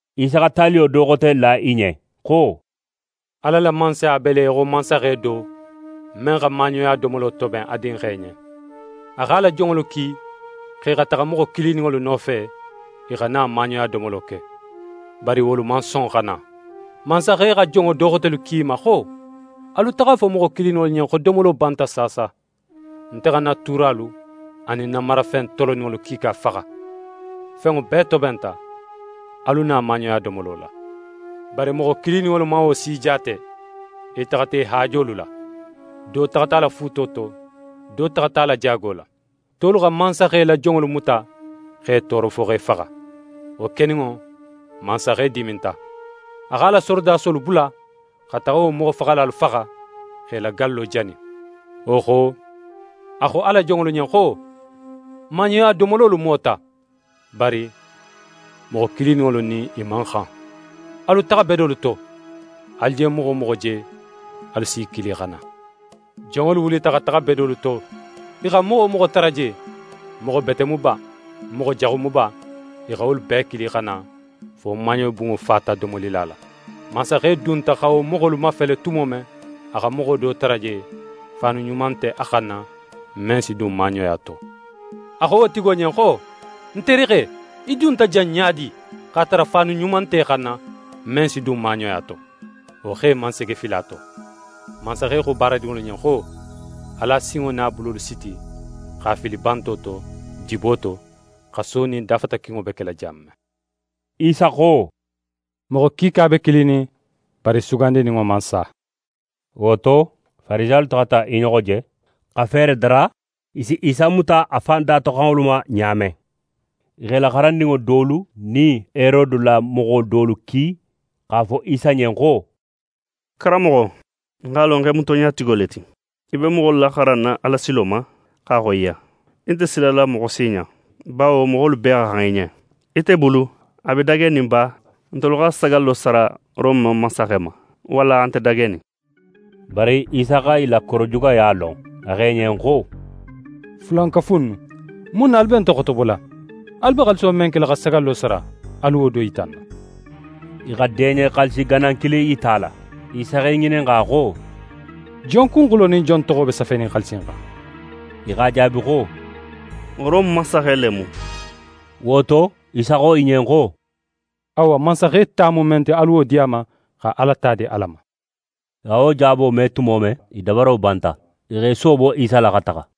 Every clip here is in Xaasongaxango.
Isa xa taliyo do xote la i ɲen xo: «Ala la Mansaya be le í xo mansaxe do, men xa maaɲoya domolo toben a dinxe ɲen. A x'a la jonŋolu ki xo i xa taxa moxo kilininŋolu nofe, i xa na maaɲoya domolo ke. Bari wolu man son xa na. Mansaxe xa jonŋo do xotelu ki i ma xo: “Alu taxa a fo moxo kilininŋolu ɲen xo domolo banta saasa. Nte xa ń na tuuralu anin ń na marafen toloninŋolu kiika faxa. Fenŋo bee tobenta, alu na maaɲoya domolo la.” Bari moxo kilininŋolu man wo si jaate, i taxata i haajolu la. Do taxata a la fuuto to, do taxata a la jaago la. Tolu xa mansaxe la jonŋolu muta x'e tooro fo x'e faxa. Wo keninŋo, mansaxe diminta. A x'a la sorodasolu bula xa taxa wo moxofaxalalu faxa, x'e la gallo jani. Wo xo, a xo a la jonŋolu ɲen xo: “Maaɲoya domololu mota, bari moxo kilininŋolu nin i man xan. Alu taxa bedolu to, alu je moxo wo moxo je, alu si i kili xa na.” Jonŋolu wulita xa taxa bedolu to, i xa moxo wo moxo tara je, moxo bete mu ba, moxo jaxu mu ba, i xa wolu bee kili xa na, fo maaɲobunŋo fata domolila la. Mansaxe dunta xa wo moxolu mafele tumo men, a xa moxo do tara je, faanu ɲuma nte a xanna men si dun maaɲoya to. A xo wo tigi ɲen xo: “Ń terixe, í dunta jan ɲa di, x'a tara faanu ɲuma nte í xanna men si dun maaɲoya to?” Wo xe man sege fili a to. Mansaxe xo baaradinŋolu ɲen xo: “Alu a sinŋo nin a bulolu siti x'a fili banto to, dibo to, xaso nin dafatakinŋo be kela jan men.” Isa xo: “Moxo kiika be kilinin, bari sugandininŋo man sa”.» Wo to, Farisiyalu taxata i ɲoxo je, xa feere dara i si Isa muta a fan datoxanŋolu ma ɲa men. I x'e la xarandinŋo dolu nin Herode la moxo dolu ki, x'a fo Isa ɲen xo: «Karanmoxo, n x'a lon xo í mu tonɲatigo le ti. Í be moxolu laxaranna Alasilo ma x'a xoyiya. Í nte silala moxo si ɲa; bawo moxolu bee xa xan í ɲen. Ite bulu, a be dagenin ba ntelu xa sagallo sara Rome mansaxe ma, walla a nte dagenin?» Bari Isa xa i la korojugaya lon, a xo i ɲen xo: «Fulankafu innu, mun na alu be nte xotobola? Alu be xaaliso men kela xa sagallo sara, alu wo do yita ń na.» I xa deɲe xaalisi ganan kilin yita a la. Isa x'e ŋininxa xo: «Jon kunxulo nin jon toxo be safenin xaalisi in xan?» I x'a jaabi xo: «Rome mansaxe le mu». Wo to, Isa xo i ɲen xo: «Awa, mansaxe ta mu men ti, alu wo di a ma, xa Ala ta di Ala ma.» I xa wo jaabo me tumo men, i dabaro banta. I x'e soobo Isa la xa taxa.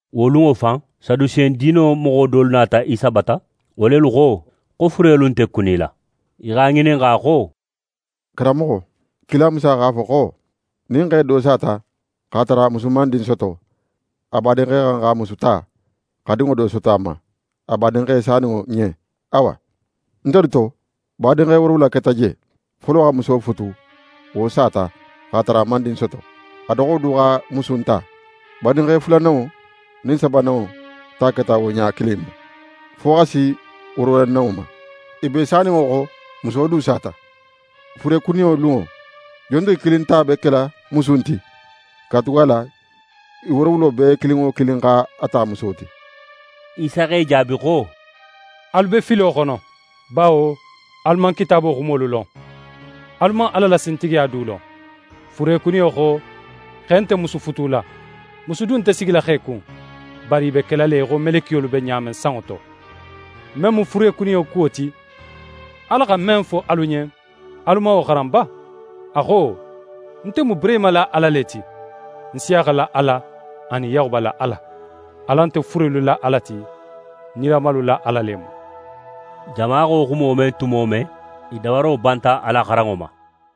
Wo lunŋo fan, Sadusen diino moxo dolu nata Isa bata. Wo lelu xo, xo furelu nte kunila. I x'a ŋininxa xo: «Karanmoxo, kila Musa x'a fo xo, nin xe do sata, x'a tara a musu man din soto, a badinxe xa xan xa wo muso ta, xa dinŋo do soto a ma, a badinxe saninŋo ɲen. Awa, ntelu to, badinxe woorowula keta je. Folo xa muso futu, wo sata, x'a tara a man din soto. A doxo du xa musu in ta. Badinxe fulananŋo nin sabananŋo ta keta wo ɲa kilin in ma, fo xa si woorowulananŋo ma. I bee saninŋo xo, muso du sata. Furekuniyo lunŋo, jontigi kilin ta be kela musu in ti; katugala i woorowulo bee kilin wo kilin x'a ta muso ti?» Isa x'e jaabi xo: «Alu be filo xono, bawo alu man Kitaabo xumolu lon, alu man Ala la sintigiya du lon. Furekuniyo xo, xe nte musu futula, musu du nte sigila xe kun, bari i be kela le í xo melekiyolu be ɲa men sanŋo to. Men mu furekuniyo kuwo ti, Ala xa men fo alu ɲen, alu man wo xaran ba? A xo: “Nte mu Burehima la Ala le ti, Nsiyaxa la Ala, anin Yaxuba la Ala.” Ala nte furelu la Ala ti, nilamalu la Ala le mu.» Jama xa wo xumo me tumo men, i dabaro banta a la xaranŋo ma.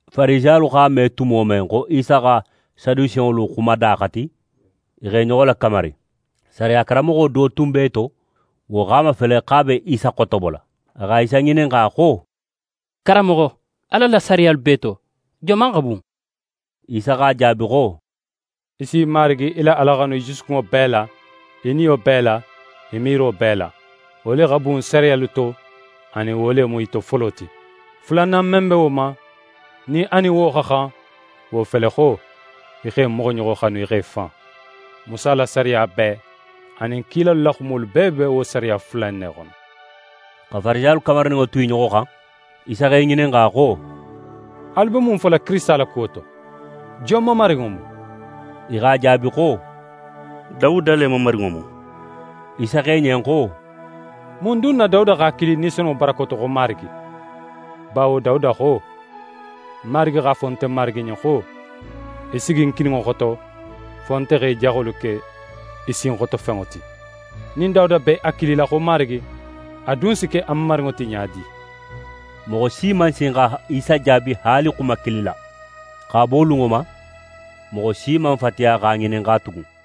Farisiyalu x'a me tumo men xo Isa xa Sadusenŋolu xumada xati, i x'e ɲoxo lakamari. Sariya karanmoxo do tun be i to, wo x'a mafele xo a be Isa xotobola. A xa Isa ŋininxa xo: «Karanmoxo, Ala la sariyalu bee to, joman xa bun?» Isa x'a jaabi xo: «Í si Marigi í la Ala xanu í jusukunŋo bee la, í niyo bee la, í miiro bee la. Wo le xa bun sariyalu to anin wo le mu i to folo ti. Fulanan men be wo ma, nin a nin wo xa xan, wo fele xo: “Í xa í moxoɲoxo xanu í xo í fan.” Musa la sariya bee anin kilalu la xumolu bee be wo sariya fula in ne xono.» Xa Farisiyalu kamarininŋo tu i ɲoxo xan, Isa x'e ŋininxa xo: «Alu be mun fola Kirisita la kuwo to? Jon mamarinŋo mu?» I x'a jaabi xo: «Dawuda le mamarinŋo mu.» Isa xo i ɲen xo: «Mun dun na Dawuda x'a kili Ni Senunŋo barako to xo Marigi? Bawo Dawuda xo: “Marigi x'a fo nte Marigi ɲen xo: Í sigi ń kininŋo xoto, fo nte xa í jaxolu ke í sinxotofenŋo ti.” Nin Dawuda be a kilila xo Marigi, a dun si ke a mamarinŋo ti ɲa di?» Moxo si man sin xa Isa jaabi haali xuma kilin na. X'a bo wo lunŋo ma, moxo si man fatiya x'a ŋininxa tugun.